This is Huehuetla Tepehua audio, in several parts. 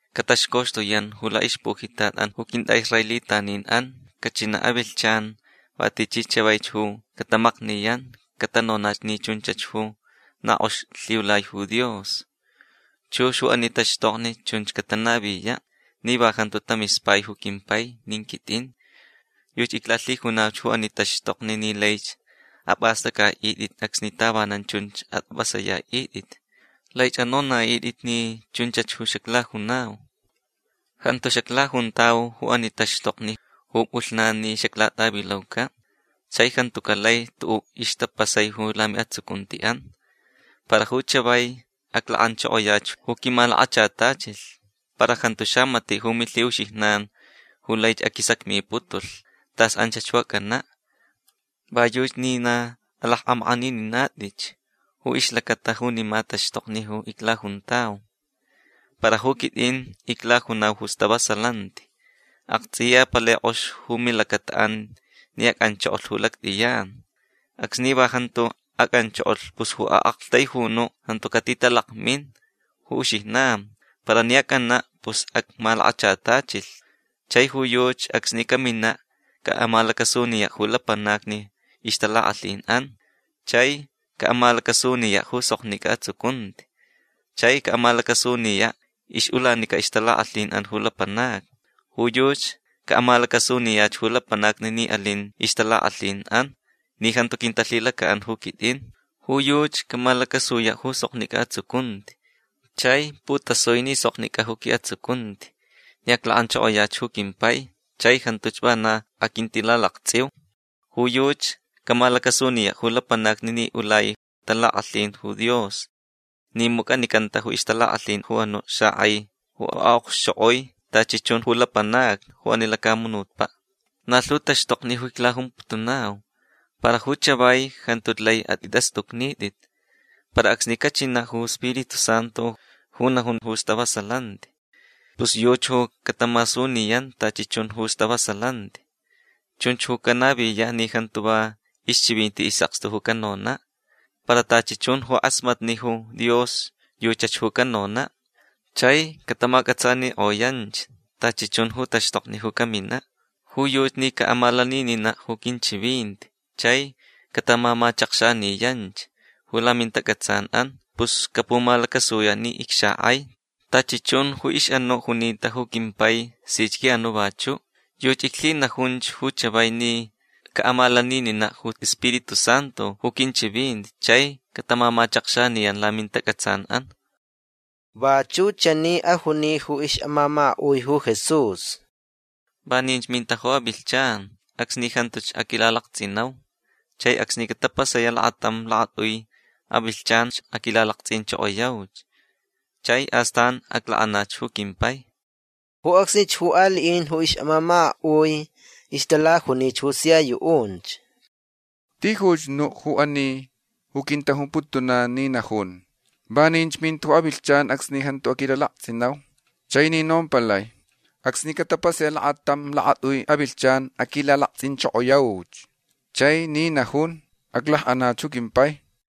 Cataxcoxtuyan ju laʼixpujitatʼan ju quintʼaʼisraelitaninʼan. Cachinaʼ avilhchan va tichi chavaich ju catamakniyan catanonach ni chunchach ju na kʼox lhiulai ju Dios. Chux ju ani taxtokni chunch catanaviyaʼ ni va jantu tamispai ju quimpai nin quitʼin. Yuchi iclalhijunauch ju ani taxtokni ni laich apʼastʼacʼaʼitʼit acsni tavanan chunch atʼapʼasayaʼitʼit. Laich anonaʼitʼit ni chunchach ju xaclajunau. Jantu xaclajuntau ju ani taxtokni ju pʼulhnan ni xaclatʼavilaucaʼ. Chai jantucaʼ lai tuʼuʼ ixtapasai ju lamiʼatsucuntiʼan. Para ju chavai aclakʼanchokoyach ju quimalakachatachilh. Para jantu xamatiʼ ju milhiʼuxijnan ju laich aquisacmiputulhch tas anchach ju acʼanaʼ. Va yuchi ni na alakʼamakʼanininatʼitch ju ixlacata junima taxtokni ju iclajuntau. Para ju quitʼin iclajunau ju stavasalanti. Aktsʼiya palai kʼox ju milacataʼan ni acʼanchokolh ju lactʼiyan. Acsni va jantu acʼanchokolh pus ju aʼaktaijunuʼ jantu catitalakmin ju uxijnan. Para ni acʼanaʼ pus acmalakachatachilhch. Chai ju yuchi acsni caminaʼ caʼamalacasuniyaʼ ju lapanacni ixtalakʼalhinʼan. Chai caʼamalacasuniyaʼ ju soknicʼa atsucunti. Chai caʼamalacasuniyaʼ ixʼulanica ixtalakʼalhinʼan ju lapanacni. Ju yuchi caʼamalacasuniyach ju lapanacni ni alin ixtalakʼalhinʼan ni jantu quintalhilacaʼan ju quitʼin. Ju yuchi camalacasuyaʼ ju soknicʼa atsucunti. Chai putasui ni soknicʼa ju quiʼatsucunti ni aclakʼanchokoyach ju quimpai chai jantuch vana aquintilalaktsʼiu. Ju yuchi camalacasuniyaʼ ju lapanacni ni ulai talakʼalhin ju Dios ni mucʼanicantach ju ixtalakʼalhin ju anuʼ xakʼai ju aʼokxchokʼoi tachi chun ju lapanacni ju ani lacamunutpaʼ. Na lhu taxtokni ju iclajumputunau. Para ju chavai jantuch lai atʼitʼastʼucnitʼit. Para acsni cachinaʼ ju Spiritu Santu ju najun ju stavasalanti pus yuchi ju catamasuniyan tachi chun ju stavasalanti. Chunch ju canaviyaʼ ni jantu va ixchivinti isʼakstu ju canonaʼ. Para tachi chun ju kʼasmatni ju Dios yuchach ju canonaʼ. Chai catamacʼatsanikʼoyanch tachi chun ju taxtokni ju caminaʼ. Ju yuchi ni caʼamalanininaʼ ju quinchivinti chai catamamachakxaniyanch ju lamintacʼatsanʼan pus capumalacasuyaʼ ni icxakʼai. Tachi chun ju ixʼanuʼ junita ju quimpai sich quiʼanuʼ vachuʼ. Yuchi iclhinajunch ju chavai ni caʼamalanininaʼ ju Spiritu Santu ju quinchivinti chai catamamachakxaniyan lamintacʼatsanʼan. Vachuʼ chani ju ajuni ju ixʼamamakaʼun ju Jesús: ―Vaninch minta ju avilhchan acsni jantuch aquilalaktsʼinau. Chai acsni catapasayaʼ lakatam lakatʼui avilhchanch aquilalaktsʼinchokoyauch. Chai astan aclakʼanach ju quimpai. Ju acsnich ju aliʼin ju ixʼamamakaʼui ixtalajunich ju sia yuʼunch: ―Tijuch nuʼ ju ani ju quintajumputunan ni najun: “Vaninch minta ju avilhchan acsni jantu aquilalaktsʼinau”. Chai ni nompalai: “Acsni catapasayaʼ lakatam lakatʼui avilhchan aquilalaktsʼinchokoyauch”. Chai ni najun: “Aclakʼanach ju quimpai”.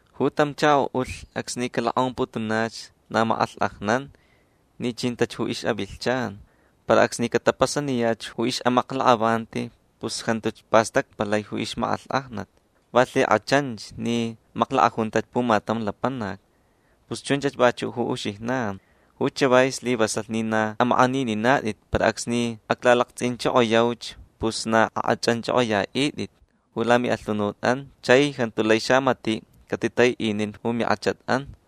Ju tam chakoʼulh acsni calokʼomputunach na makʼalhkʼajnan ni chintach ju ixʼavilhchan. Para acsni catapasaniyach ju ixʼamaklakʼavanti pus jantuch pastacpalai ju ixmakʼalhkʼajnat. Va lhikʼachanch ni maklakʼajuntach pumatam lapanac. Pus chunchach vachuʼ ju uxijnan. Ju chavai slivasalh ni na amakʼanininatʼit. Para acsni aclalaktsʼinchokoyauch pus na akʼachʼanchʼokʼoyaʼitʼit ju lamiʼalhunutʼan. Chai jantu lai xamatiʼ catitataiʼinin ju minkʼachatʼan.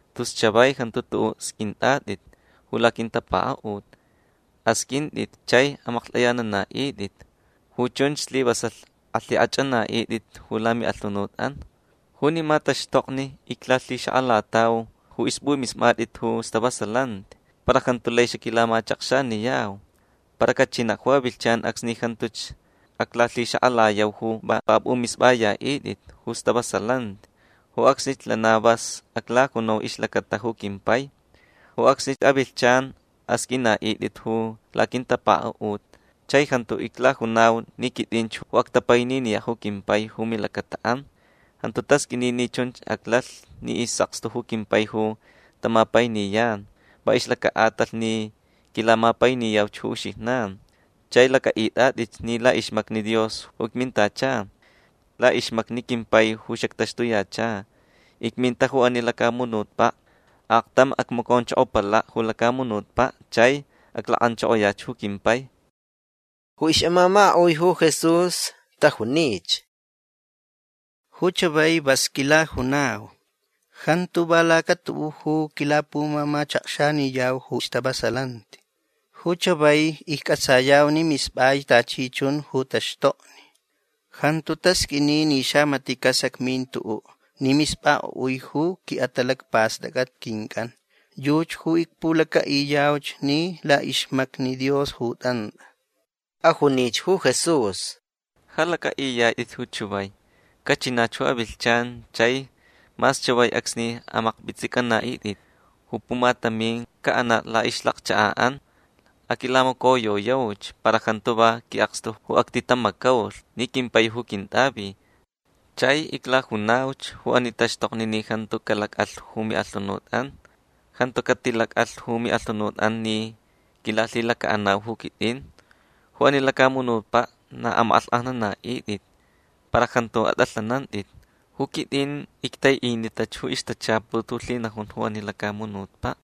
Tus chavai jantu tuʼuʼ sqʼuintʼatʼit ju laquintapakaʼut. Asqʼuintʼit chai amaklhtʼayananaʼitʼit. Ju chunch slivasalh alhikʼachʼanaʼitʼit ju lamiʼalhunutʼan. Junima taxtokni iclalhixakʼalatau ju ispʼumispʼatʼit ju stavasalanti. Para jantu lai xaquilamachakxaniyau. Para cachinaʼ ju avilhchan acsni jantuch aclalhixakʼalayau ju va apʼumispʼayaʼitʼit ju stavasalanti. Ju acsnich lana vas aclajunau ixlacata ju quimpai. Ju acsni avilhchan asqʼuinaʼitʼit ju laquintapakaʼut chai jantu iclajunau ni quitʼinch ju actapaininiyaʼ ju quimpai ju milacataʼan. Jantu tasqʼuini ni chun aclalh ni isʼakstu ju quimpai ju tamapainiyan va ixlacaʼatalh ni quilamapainiyauch ju uxijnan chai lacʼaʼitʼatʼitch ni laʼixmacni Dios ju icmintacha. Laʼixmacni quimpai ju xactaxtuyacha. Icminta ju ani lacamunutpaʼ. Aktam acmaconchokopalaʼ ju lacamunutpaʼ chai aclakʼanchokoyach ju quimpai. Ju ixʼamamakaʼui ju Jesús tajunich: ―Ju chavai vasch quilajunau. Jantu va lacatuʼuʼ ju quilapumamachakxaniyau ju stavasalanti. Ju chavai iccʼatsayauch ni mispʼaich tachi chun ju taxtokni. Jantu tasqʼuini ni xamatiʼ casacmin tuʼuʼ ni mispʼakʼoʼui ju quiʼatalacpastʼacʼat quincʼan. Yuchi ju icpulacaʼiyauch ni laʼixmacni Dios ju tʼantʼa. Ajunich ju Jesús: ―Ja lacʼaʼiyatʼitch ju chavai. Cachinach ju avilhchan chai mas chavaich acsni amakpʼitsʼicʼanaʼitʼit. Ju pumatamin caʼanaʼ laʼixlakchakaʼan. Aquilamacoyoyauch. Para jantu va quiʼakstu ju actitamacaulh ni quimpai ju quintʼavi. Chai iclajunauch ju ani taxtokni ni jantu calacʼalh ju miʼalhunutʼan. Jantu catilacʼalh ju miʼalhunutʼan ni quilalhilacaʼanau ju quitʼin. Ju ani lacamunutpaʼ na amakʼalhkʼajnanaʼitʼit. Para jantu atʼalhanantʼit. Ju quitʼin ictaiʼinitach ju ixtachaput ju lhinajun ju ani lacamunutpaʼ.